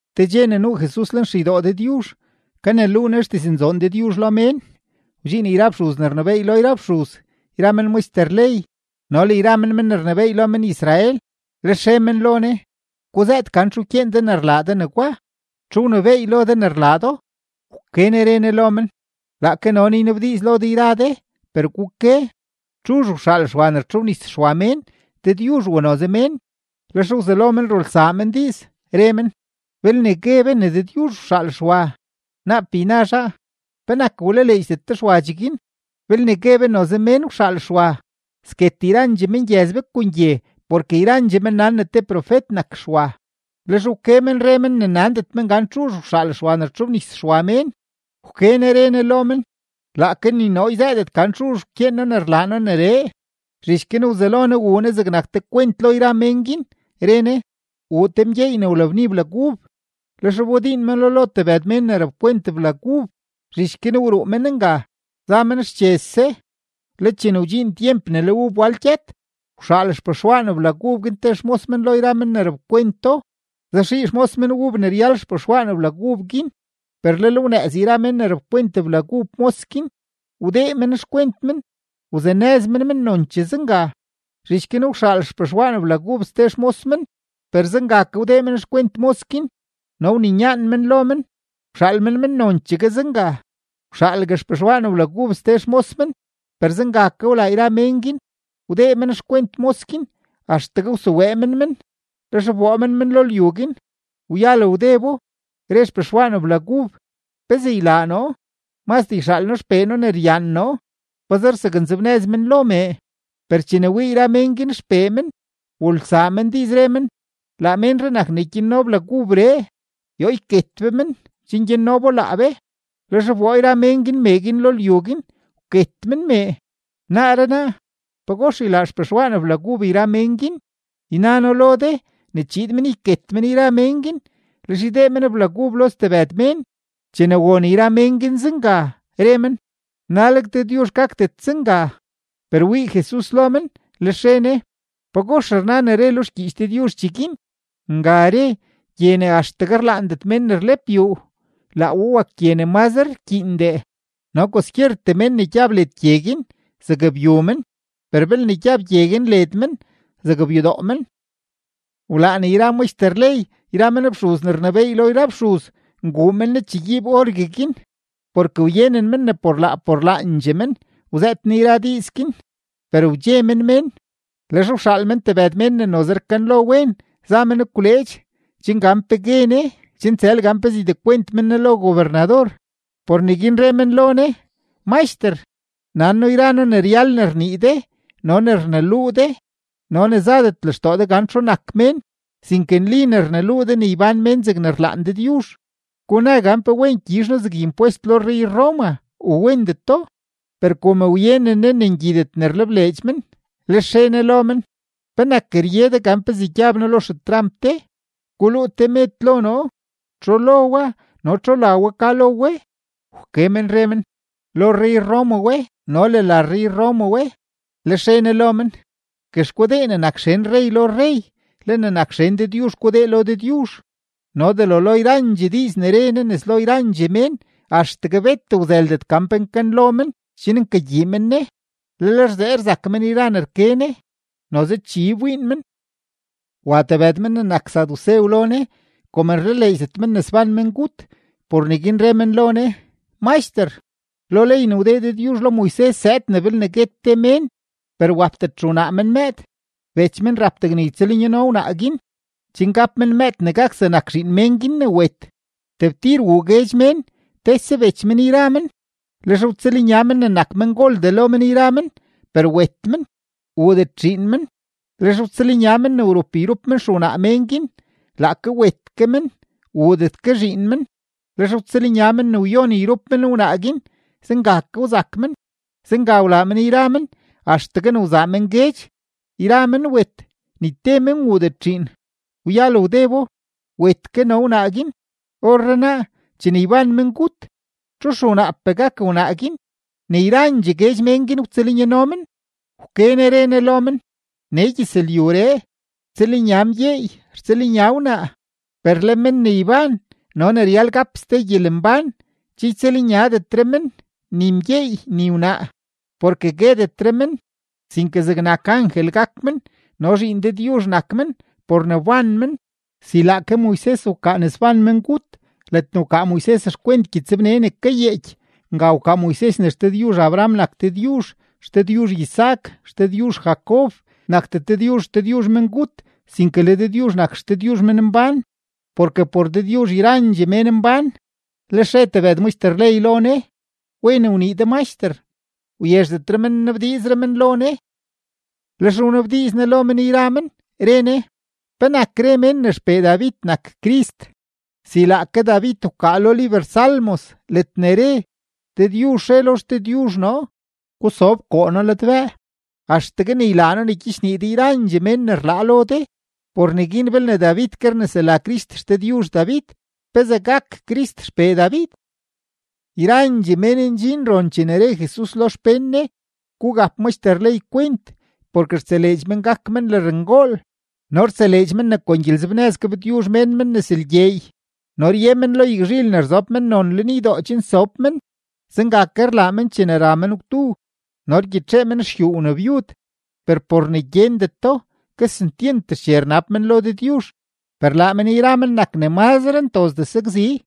Te dxe ne nuu Jesus lenxeydoo Dëdyuzh, kaneluu Ne xdiznzoon Dëdyuzh lo mén, wdxiin yra fxuz ne rnebééy lo yra fxuz yra men maxter ley no le yra men men ne rnebééy lo men-Israel. Lex re men lo Ne: ―Guzëët gan txu wkyeen de ne rlaa de negwa. ¿Txu wnebééy lo de ne rlaa do? Wke Ne re Ne lo men: ―Laake no ke noo ynabdiiz lo de yra de, per guke: ¿txuzh wxaal Xwa ne wtxobnis Xwa mén, Dëdyuzh u noze mén? Lex wzelo men rulsaa men diiz, re men: ―Belne gue be ne Dëdyuzh wxaal Xwa, naap yna zhaa: “¿Penak wlaleedxdet de Xwa cheguin?” Belne gue be noze mén wxaal Xwa, sket yrandxee mengyëz be kon gye porke yrandxee men nan ne te profet nak Xwa. Lex wke men re men ne nandet men gan txuzh wxaal Xwa ne rtxobnis Xwa mén. Wke Ne re Ne lo men: ―Laake ni noo yzëëdet gan txuzh wkyeen noo ne rlaa noo neree. Zhich guin wzelo Jesus wuu Ne zegnak te kwent lo yra mén guin, re Ne: ―Wuu te mgyeey ne wlabni blag ub, lex wbodiin meno lo tebëd mén ne rapkwent blag ub. Zhich guin wruu men nga, za men xchese. Le chene wdxiin tyemp ne le ub wal gyët, wxaal xpexwaan blag ub guin te xmos men lo yra men ne rapkwento, zaxii xmos men ub ne ryal xpexwaan blag ub guin. Per lel wnëëz yra men ne rapkwent blag ub mos guin, wdee men xkwent men, wzanëz men men nonchee zenga. Zhich guin wxaal xpexwaan blag ub ste xmos men; per zenga ke wdee men xkwent mos guin no wninyaan men lo men, wxaal men men nonchegue zenga. Wxaalgue xpexwaan blag ub ste xmos men; per zenga ke wlaa yra mén guin, wdee men xkwent mos guin axtegue wsewee men men, lex wboo men men lo lyu guin. ’Wyal wdebo, re xpexwaan blag ub: “¿Pezee ylaa noo? Mazdee yxaal xpee noo ne ryaan noo; pazer zaknzebnëz men lo mee.” Per chene wii yra mén guin xpee men, wulsaa men diiz, re men: “Laa ménree nak ne gyanno blag ubree; yoo yket be men, chen gyanno bo laa be.” Lex wboo yra mén guin mee guin lo lyu guin, wket men mee. ’Naaree naa, ¿pagox ylaa xpexwaan blag ub yra mén guin? Yna noo lo de ne chiid men yket men yra mén guin, lex ydee men blag ub lo stebëd mén. Chene won yra mén guin zenga, re men: ―¡Naleg Dëdyuzh gakdet zenga! Per wii Jesus lo men, lex re Ne: ―¿Pagox rna ne re lo xgyiich Dëdyuzh cheguin? Nga re: Gye ne axtegue rlaandet mén ne rlep yuu, laa we wak gye ne mazre rkyiindee. No kwaskyertee men ne gyab led gye guin, zakbyu men, per belne gyab gye guin led men, zakbyudoo men. Wlaan yra maxter ley yra men fxuz ne rnebééy lo yra fxuz nguu men Jesus chegyiib orgueguin, porke wyenen men ne por laa por laandxee men wzëët Ne yra diiz guin, per wdxe men mén. Lex wxaal men tebëd mén ne noze rkanlo wen, za men gwleedx, chen gan pe gue Ne chen tsël gan pezee ydekwent men Ne lo gobernador. Por neguin re men lo Ne: ―Maxter, nan noo yra noo ne ryal ne rnii de no ne rneluu de no ne zadet lextoo de gan txu nak mén, sinke nli ne rneluu de ne ybán mén zegne rlaan Dëdyuzh. Guna gan ¿pe wen gyizh noo zeg impwest lo rrey-Roma u wendeto? Per kom wyenen Ne ne ngyidet ne rlebleedx men, lex re Ne lo men: ―¿Penak rye de gan pezee gyab noo lo xetramp de? Guluu te med lo noo. ¿Txu lo wa no txu la wa ka lo we? Wke men re men: ―Lo rrey-Roma we no le la rrey-Roma we. Lex re Ne lo men: ―Guex gudee ne nak xen rrey lo rrey, le ne nak xen Dëdyuzh gudee lo Dëdyuzh. No delo lo yrandxee diiz ne re Ne nes lo yrandxee mén, axtegue bet wzëldet gan pe nkanlo men chen nkagyii men Ne, lel rzee rzak men yra ne rke Ne. Noze chi wbiin men. Wa tebëd men ne nak sadusew lo Jesus. Kom rlaleedxdet men ne sban mengut, por neguin re men lo Ne: ―Maxter, lo ley ne wdee Dëdyuzh lo Moises zëëd ne belne guet te mén, per wapdet xewnaa men mëëd, bech men rap degne ytsëlnyano wnaa guin, chen gap men mëëd ne gak zegnak zhiin mén guin ne wet. Tebtir wuu guedx mén, tese bech men yra men; lex wtsëlnya men ne nak mengoldee lo men yra men, per wet men; wuudet zhiin men. Lex wtsëlnya men ne wrup yrup men xewnaa men guin. Laake wet ke men; wuudet ke zhiin men. Lex wtsëlnya men ne wyon yrup men wnaa guin, zenga ke wzak men. Zenga wlaa men yra men axtegue ne wzaa men guedx, yra men wet; ni te men wuudet zhiin. Wyal wdebo, wet ke no wnaa guin. Orrenaa, chene yban mengut, ¿txu xewnaapee gak wnaa guin ne yrandxee guedx mén guin wtsëlnyano men? Wke Ne re Ne lo men: ―Nee gyëzlyuree, rtsëlnya mgyeey, rtsëlnya wnaa. Per le men ne yban no ne ryal gap ste gyelembán, che ytsëlnyadetre men, ni mgyeey ni wnaa, porke guetetre men, sinke zegnak angel gak men no zhiin Dëdyuzh nak men por ne wban men. Si laake Moises wkaa ne sban mengut, ledne wkaa Moises xkwent gyëtsbne ne kayeeky. Nga wkaa Moises ne XDëdyuzh Abraham nak Dëdyuzh, XDëdyuzh Isaac, XDëdyuzh Jacob. Nakdet Dëdyuzh XDëdyuzh mengut, sinke le Dëdyuzh nak XDëdyuzh menmbán, porke por Dëdyuzh yrandxee mén mbán. Lex re tebëd maxter ley lo Ne: ―Wen wnii de, Maxter. Wyezhdetre men nnabdiizre men lo Ne. Lex wnabdiiz Jesus lo men yra men, re Ne: ―¿Penak re mén ne xpee David nak Crist? Si laake David wkaa lo liber Salmos ledne re: Dëdyuzh re lo XDëdyuzh noo: “Gusob koo noo ladbëë axtegue ne ylaa noo ne gyichnii de yrandxee mén ne rlaa lo de.” Por neguin belne David ke rnesela Crist XDëdyuzh David, ¿pezee gak Crist xpee David? Yrandxee mén ndxin ron chene re Jesus lo xpén Ne: ―Gugap maxter ley kwent, porke rtseleedx men gak men lërngool, no rtseleedx men ne kon gyelenzebnëz gabtyuzh mén men nes lgyeey, no rye men lo yagzhil ne rzob mennon lenydoo chen sob men; zenga ke rlaa men chene ra men gwdu, no rgyitxee men xyuu wnabyud, per por ne gyendeto, kesentyent xche rnab men lo Dëdyuzh, per laa men yra men nak ne ntozdee sakzi.